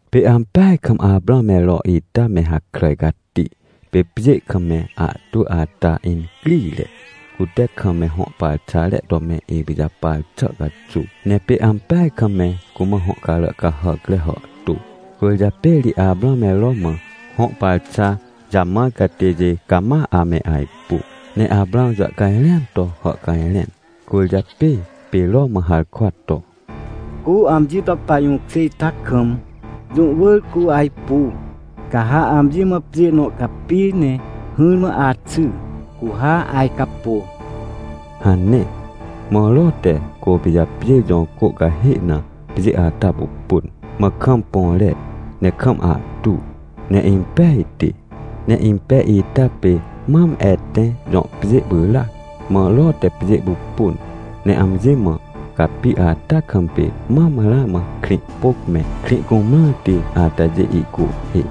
Pê ampeaj kam Aprãw me Ro ita me hakràj cati. Pê pjê kam me ahtwỳ ata incrire, cute kam me hõ parxare to me ipijapar xà caxuw, ne pê ampeaj kam me cumã hõ carà cahàcre hàhtô. Cwỳrjapê ri Aprãw me Ro mã hõ parxa jamãr catêjê cama ame ajpu. Ne Aprãw jàhcajrẽan to hàhcajrẽn, cwỳrjapê pê Ro mã harkwa to: — Cu amji to pajũkjê ita kam, jũ wỳr cu ajpu. Ca ha amji mã pjê nõ capi ne hỹrmã axy, cu ha ajcapô — hane. Mã Ro te Côpijapjêr jõ cô cahê na pjê ata pupun, mã kam põre, ne kam ahtu, ne impejti, ne impej ita pê mam Etẽ jõ pjê pyràac. Mã Ro te pjê pupun, ne amji mã capi ata kam pê mam ramã Krĩhpôc me Krĩhcumrãrti atajê ihcuhhê.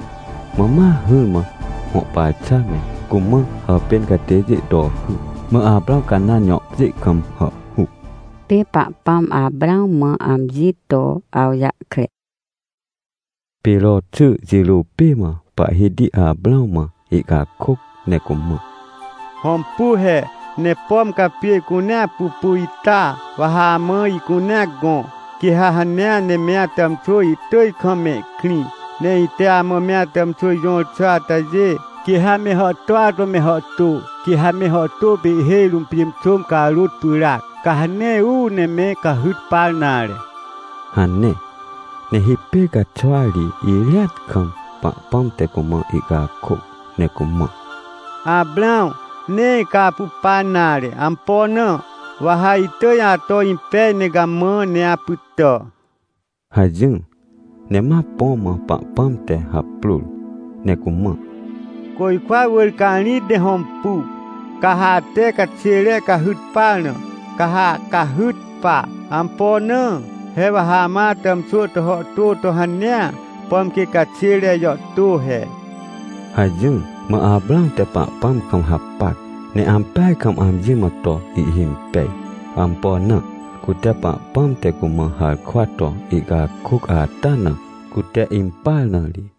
Mã ma hỹrmã hõ parxa me, cumã hàpên catêjê to hy. Mã Aprãw Canãn jõ pjê kam hàhhuc. Pê Pahpãm Aprãw mã amji to awjahkre Pê Ro xy jirô pê mã Pahhiti Aprãw mã ihcakôc ne cumã: — Hõmpu he, ne pom ca pjê cunea pupu ita, wa ha amã ihcunea gõ, quê ha hanea ne me atàmxwỳ ihtỳj kam mehkrĩ. Ne ite amã me atàmxwỳ jõr xà atajê, quê ha me hàhtôa to me hàhtô. Quê ha me hàhtô pê ihhêj rũm pjênxôm carôt pyràac, ca ha nee uu ne me cahyt par nare — hane. Ne hipêr caxwa ri irĩat kam, Pahpãm te cumã ihcakôc, ne cumã: — Aprãw, nee ca apu pa nare. Ampo na? Wa ha itỳj ato impej ne gamã, ne apytà — hajỹr. Ne ma põ mã Pahpãm te haprôr ne cumã: — Côjkwa wỳr ca rĩt ne hõmpu, ca ha ate caxêre cahyt par na, ca ha cahyt pa. Ampo na? He wa ha amã atàmxwỳ to hàhtô to hanea, pom quê caxêre jàhtô he — hajỹr. Mã Aprãw te Pahpãm kam hapac, ne ampeaj kam amji mã to ihhimpej. Ampo na? Cute Pahpãm te cumã harkwa to ihcakôc ata na, cute impar na ri.